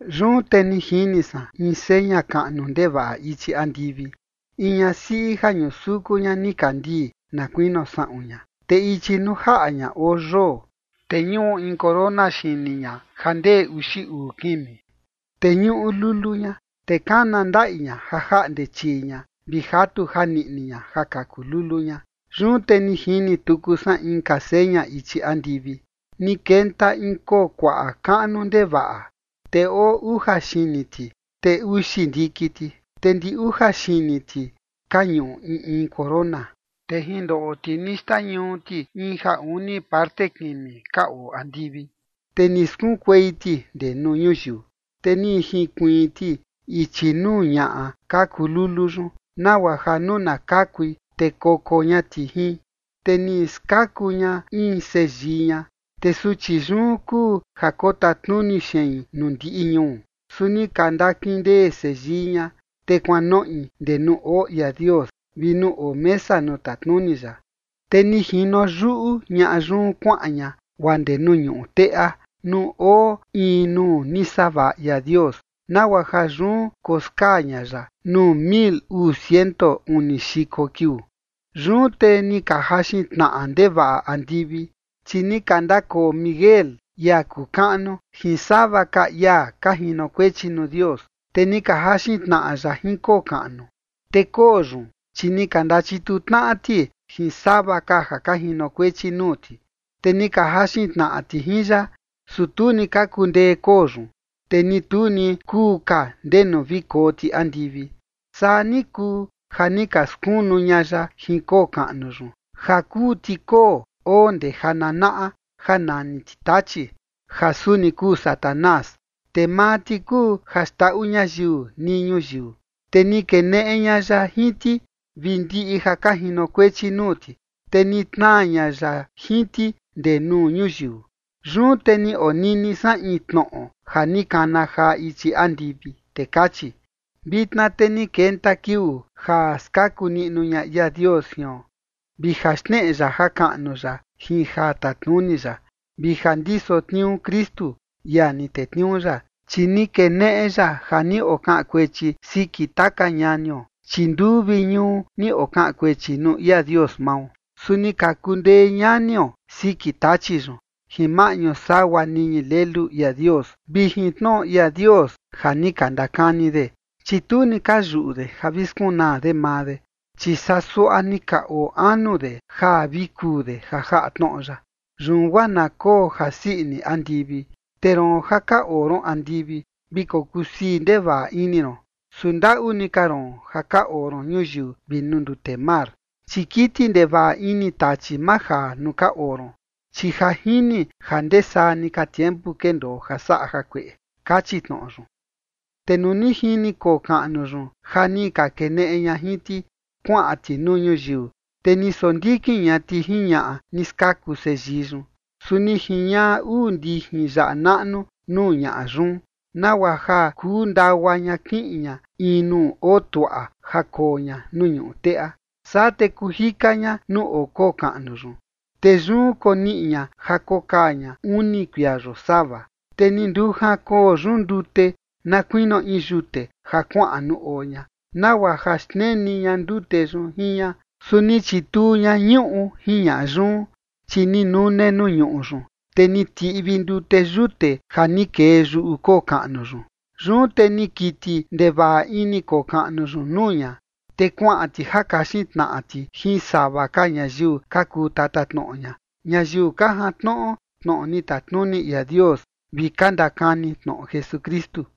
Yun te ni jini san in seña kaꞌnu ndevaꞌa ichi andivi: in ñasiꞌi ja ñusuku ña nikandii na kuinio saꞌun ña, te ichi nuu jaꞌa ña oo yoo, te ñuꞌu in corona xini ña ja ndee uxi uu kimi. Te ñuꞌu lulu ña. Te kana ndaꞌi ña ja jaꞌnde chii ña vi jatu janiꞌni ña ja kaku lulu ña. Yun te ni jini tuku san inka seña ichi andivi: ni kenta in koo kuaꞌa kaꞌnu ndevaꞌa, te oo uja xini ti, te uxi ndiki ti, te ndi uja xini ti ka ñuꞌu in in corona. Te jin ndoꞌo ti ni xtañuu ti in ja uni parte kimi ka oo andivi, te ni skunkuei ti ndee nuu ñuyiu. Te ni jinkuiin ti ichi nuu ñaꞌa kaku lulu yun, nagua ja nuu na kakui, te koko ña ti jin. Te ni skaku ña in seyii ña, te suchi yun kuu ja kotatnuni xein nuu ndiꞌi ñuu. Su ni ka ndakindee seyii ña, te kuanoꞌi ndee nuu oo ia Dios vi nuu oo mesa nuu tatnuni ya. Te ni jino yuꞌu ñaꞌa yun kuaꞌan ña guaa ndee nuu ñuꞌu teꞌa, nuu oo in nuu ni savaꞌa ia Dios, nagua ja yun koskaa ña ya nuu mil uu ciento uni xiko kiuu. Yun te ni ka jaxin tnaꞌa ndevaꞌa andivi, chi ni ka ndakoo Miguel, ia kuu kaꞌnu, jin sava ka ia ka jinokuechi nuu Dios, te ni ka jaxin tnaꞌa ya jin koo kaꞌnu. Te koo yun, chi ni ka ndachituu tnaꞌa ti jin sava ka ja ka jinokuechi nuu ti, te ni ka jaxin tnaꞌa ti jin ya. Su tu ni ka kundee koo yun, te ni tu ni kuu ka ndenu vi koo ti andivi. Saa ni kuu ja ni ka skunu ña ya jin koo kaꞌnu yun, ja kuu ti koo oo ndee ja nanaꞌa, ja nani ti Tachi, ja suni kuu Satanás, te maa ti kuu ja xndaꞌu ñayiu nii ñuyiu. Te ni keneꞌe ña ya jin ti vi ndiꞌi ja ka jinokuechi nuu ti, te ni tnaa ña ya jin ti ndee nuu ñuyiu. Yun te ni onini san in tnoꞌo ja ni kana jaa ichi andivi, te kachi: Vitna te ni kenta kiuu ja skaku niꞌnu ña ia Dios jion, vi ja xneꞌe ya jakaꞌnu ya jin ja tatnuni ya, vi ja ndiso tniuu Kristu, ia ni tetniuu ya. Chi ni keneꞌe ya ja ni okaꞌan kuechi siki taka ñanio, chi nduu vi ñuu ni okaꞌan kuechi nuu ia Dios mao. Su ni ka kundee ñanio siki Tachi yun jin maꞌñu sagua niñi Lelu ia Dios vi jin tnoꞌo ia Dios ja ni ka ndakani de, chi tu ni ka yuꞌu de ja vi skunaa de maa de, chi saa suaꞌa ni ka oo anu de ja vi kuu de ja jaꞌa tnoꞌo ya. Yun guaa na koo jasii ini andivi te roon ja ka oo ron andivi, vi kokuu sii ndevaꞌa ini ron. Su ndaꞌu ni ka roon ja ka oo ron ñuyiu vi nuu ndute mar, chi kiti ndevaꞌa ini Tachi majaa nuu ka oo ron, chi ja jini ja ndee saa ni ka tiempu kendoo ja saꞌa jakueꞌe. Kachi tnoꞌo yun. Te nuu ni jini koo kaꞌnu yun ja ni ka keneꞌe ña jin ti kuaꞌan ti nuu ñuyiu, te ni sondikin ña ti jin ñaꞌa ni skaku seyii yun. Su ni jiñaꞌa uu ndijin yaꞌa naꞌnu nuu ñaꞌa yun, nagua ja kuu ndagua ña kiꞌin ña in nuu oo tuaꞌa ja koo ña nuu ñuꞌu teꞌa. Saa te kuu jika ña nuu oo koo kaꞌnu yun, te yun koniꞌi ña ja kokaa ña uni kuia yosava. Te ni ndujan koo yun ndute na kuinio in yute ja kuaꞌan nuu oo ña, nagua ja xneni ña ndute yun jin ña. Su ni chituu ña ñuꞌu jin ña yun, chi ni nune nuu ñuꞌu yun, te ni tiꞌvi ndute yute ja ni kee yuꞌu koo kaꞌnu yun. Yun te ni kiti ndevaꞌa ini koo kaꞌnu yun nuu ña. Te kuaꞌan ti ja kaxin tnaꞌa ti jin sava ka ñayiu ka kuu tatatnoꞌo ña, ñayiu ka jantnoꞌo tnoꞌo ni tatnuni ia Dios vi ka ndakani tnoꞌo Jesukristu.